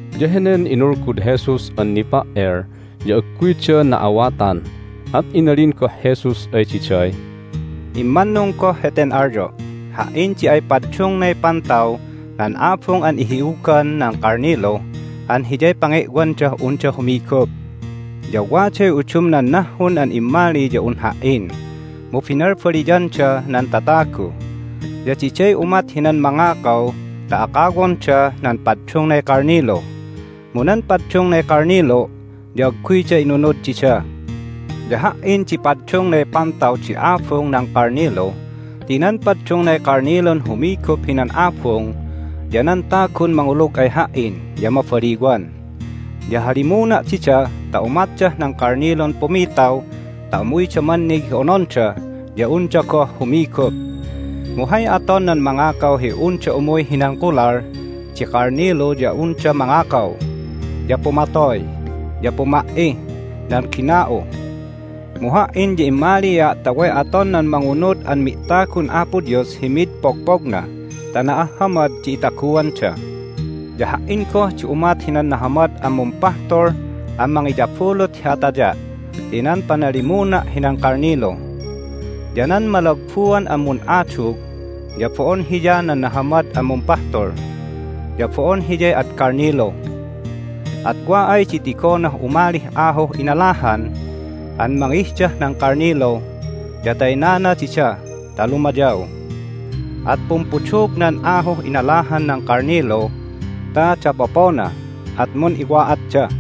Ya henen inulgud Jesus an nipa"el ya agguyda na'awatan. At inalin goh Jesus ay diday, "Immannung goh heten alyo': Ha"in di ay paddungnay Pantaw nan abung an ihi'ugan nan kalnilu an hiyay pange'wandah unda humigup. Ya waday udumnan nahhun an immali ya un Ha"in, mu binalbaliyanda nan tatagu. Ya diday umat hinan mangakaw ta akawonda nan paddungnay kalnilu. Mu nan paddungnay kalnilu' ya agguyda inunud dida. Ya Ha"in di ay paddungnay Pantaw di abung nan kalnilu ti nan paddungnay kalnilun humigup hinan abung ya nan tagun mangulug ay Ha"in ya mabaliwan. Ya halimuna' dida ta umatdah nan kalnilun pumitaw ta umuyda mannig hi ononda ya unda goh humigup. Mu hay aton nan mangakaw hi unda umuy hinan kolal di kalnilu ya unda mangakaw, ya pumatoy, ya puma"ih nan gina'u. Mu Ha"in ya immalia' ta way aton nan mangunud an mi'tagun Apo Dios hi mid pogpogna ta na'ahhamad di itaguanda. Ya Ha"in goh di umat hinan Nahamad an Mumpahtul an mangiyabulut hi ataya' ti nan panalimuna' hinan kalnilu. Ya nan malagbuan an mun'adug ya bo'on hiya nan Nahamad an Mumpahtul, ya bo'on hiyay ad kalnilu. At wa ay di tigonah umalih ahuh inalahan an mangihdah nan kalnilu ya taynana dida ta lumayaw. At pumpudug nan ahuh inalahan nan kalnilu ta dapopona, at mun'iwa'atda.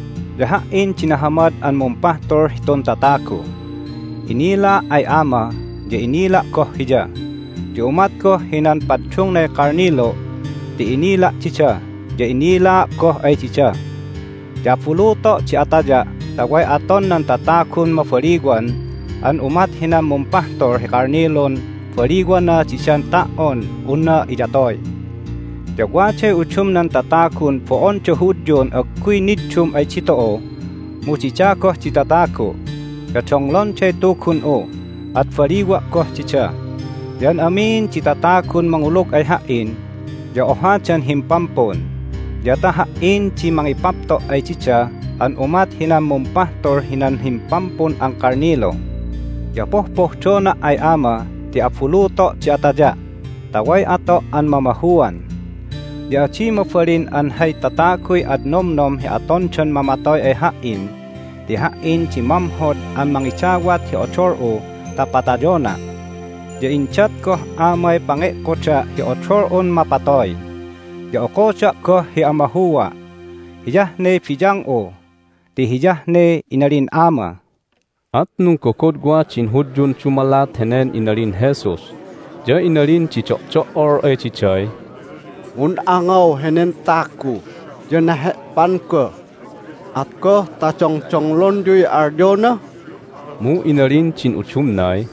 Ya Ha"in di Nahamad an Mumpahtul hitun tatagu. Inilaa' ay Ama, ya inila' goh Hiya. Ya umat goh hinan paddungnay kalnilu' ti inila' dida, ya inilaa' goh ay dida. Ya abuluto' di ataya' ta way aton nan tatagun mabaliwan an umat hinan mumpahtul hi kalnilun baliwana didan ta"on unna iyatoy. Ya waday udumnan tatagun bo'onda Hudyun agguy niddum ay ditu'u, mu dida goh di tatagu'. Ya donglonday Tugun'u, at baliwa' goh dida. Ya an amin di tatagun mangulug ay Ha"in ya ohadan himpampun, ya ta Ha"in di mangipapto' ay dida an umat hinan mumpahtul hinan himpampun an kalnilu. Ya pohpohdona' ay Ama ti abuluto' di ataya' ta way ato' an mamahuan. Ya adi mabalin an hay tataguy ad nomnom hi atondan mamatoy ay Ha"in ti Ha"in di mamhod an mangidawat hi odol'u ta patayona'. Ya indat goh Amay pange'koda' hi odol'un mapatoy, ya okoda' goh hi amahua'. Hiyah ne biyang'u ti hiyah ne inalin Ama." At nunggogodwa din Hudyun dumalat henen inalin Jesus. Ya inalin di do'do'ol ay diday, "Mun'angaw henen tagu, ya nahe'pan goh! At goh ta dongdonglonyuy alyona?" Mu inalin din udumnay,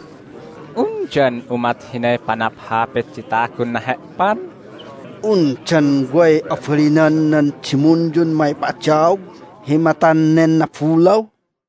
"Undan umat hinay panaphapit di tagun nahe'pan? Undan way abalinan nan dimunyun mangipa'adaog hi matan nen nabulaw?"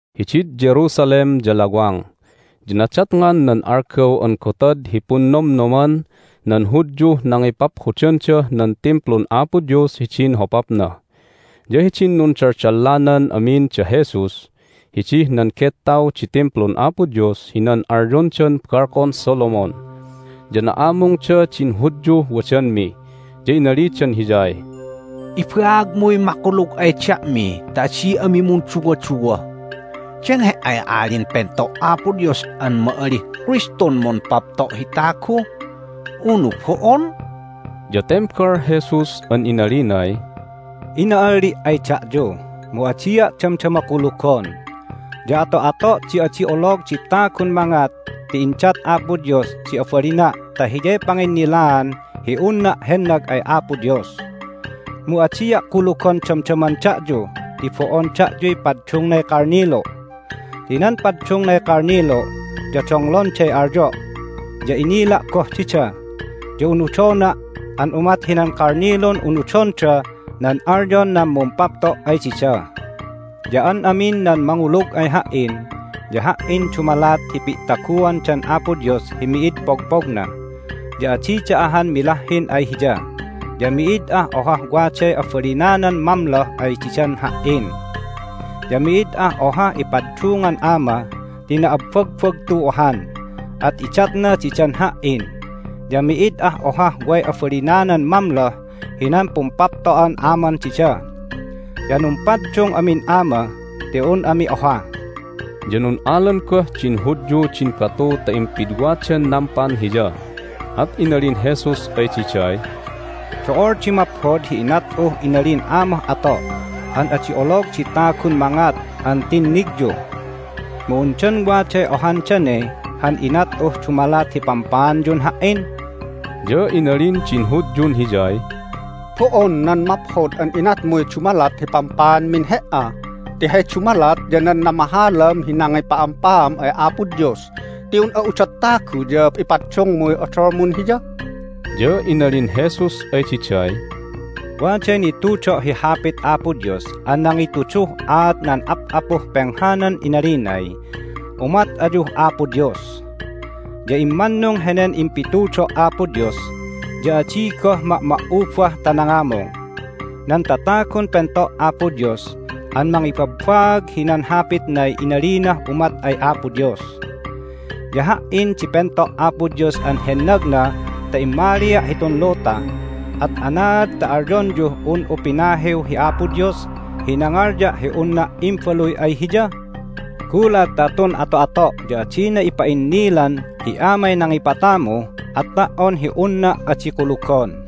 Hidid Jerusalem ya lawang, ya nadatngan nan algaw an Gotad hi Punnomnoman nan Hudyuh Nangipaphodandah nan Timplun Apo Dios hidin hopapna. Ya hidin nundaldallanan amin da Jesus hidih nan gettaw di Timplun Apo Dios hinan alyondan Balkon Solomon ya na'amungda din Hudyuh wadanmi, ya inalidan Hiyay, "Ibaagmuy makulug ay da'mi ta adi ami munduwaduwa. Dan He"ay Alin Pento' Apo Dios an ma'alih Kristun mumpapto' hi tagu, unu bo'on?" Ya tembal Jesus an inalinay, "Ina'alli' ay da'yu, mu adia' damdama kulugon. Ya ato'ato' di adi olog di tagun mangat ti indat Apo Dios di abalina' ta hiyay panginnilaan hi unna' hennag ay Apo Dios. Mu adia' kulugon damdaman da'yu ti bo'on da'yuy paddungnay kalnilu'. Ti nan paddungnay kalnilu' ya donglonday alyo', ya inila' goh dida, ya unudona' an umat hinan kalnilun unudonda nan alyon nan mumpapto' ay dida. Ya an amin nan mangulug ay Ha"in ya Ha"in dumalat hi pi'taguandan Apo Dios hi mi'id pogpogna, ya adida ahan milahhin ay Hiya. Ya mi'id ah ohah waday abalinanan mamloh ay didan Ha"in. Ya mi'id ah ohah ipaddungan Ama ti na'abbagbagtu ahan, at idatna didan Ha"in, ya mi'id ah ohah way abalinanan mamloh hinan pumpapto'an Aman dida. Ya numpaddung amin Ama ti un ami oha." Ya nun'alan goh din Hudyu din batu ta impidwadan nampan Hiya. At inalin Jesus ay diday, "Do'ol di maphod hi inat'uh inalin Amah ato' an adi olog di tagun mangat an tinnigyu. Mu undan waday ohan dane han inat'uh dumalat hi pampaanyun Ha"in?" Ya inalin din Hudyun Hiyay, "Bo'on nan maphod an inatmuy dumalat hi pampaanmin He"a, ti hay dumalat ya nan namahalam hi nangipa'ampaam ay Apo Dios! Ti un'a udot tagu, ya ipaddungmuy odolmun Hiya!" Ya inalin Jesus ay diday, "Waday nitudo' hi Hapit Apo Dios an nangituduh aat nan ap'apuh penghanan inalinay, Umat ayuh Apo Dios. Ya immannung henen impitudo' Apo Dios, ya adi goh ma'ma"ubah ta nangamung. Nan tatagun pento' Apo Dios an mangibabbaag hinan Hapitnay inalinah umat ay Apo Dios. Ya Ha"in di pento' Apo Dios an hennagna ta immalia' hitun luta. At anaad ta alyonyuh un'u pinahiw hi Apo Dios hi nangalya' hi unna' Imbaluy ay Hiya? Gulat ta tun ato'ato' ya adina ipa'innilan hi Amay nangipatamu at ta"on hi unna' adi kulugon.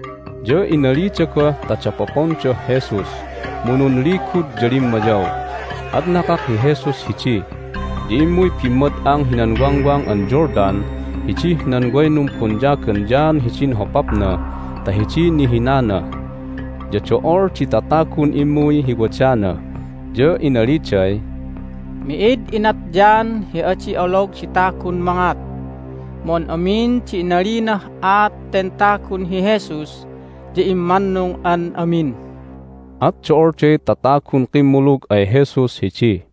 Ya inalida goh ta dapopondah Jesus, mu nunligud ya limmayaw. At nakak hi Jesus hidi, ya immuy bimmad'ang hinan Wangwang an Jordan hidih nan way numbonyagan John hidin hopapna ta hidiy nihinana. Ya do'ol di tatagun immuy hi wadana, ya inaliday, "Mi'id inat John hi adi olog di tagun mangat, mu an amin di inalinah aat ten tagun hi Jesus ya immannung an amin." At do'olday tatagun kimmulug ay Jesus hidi.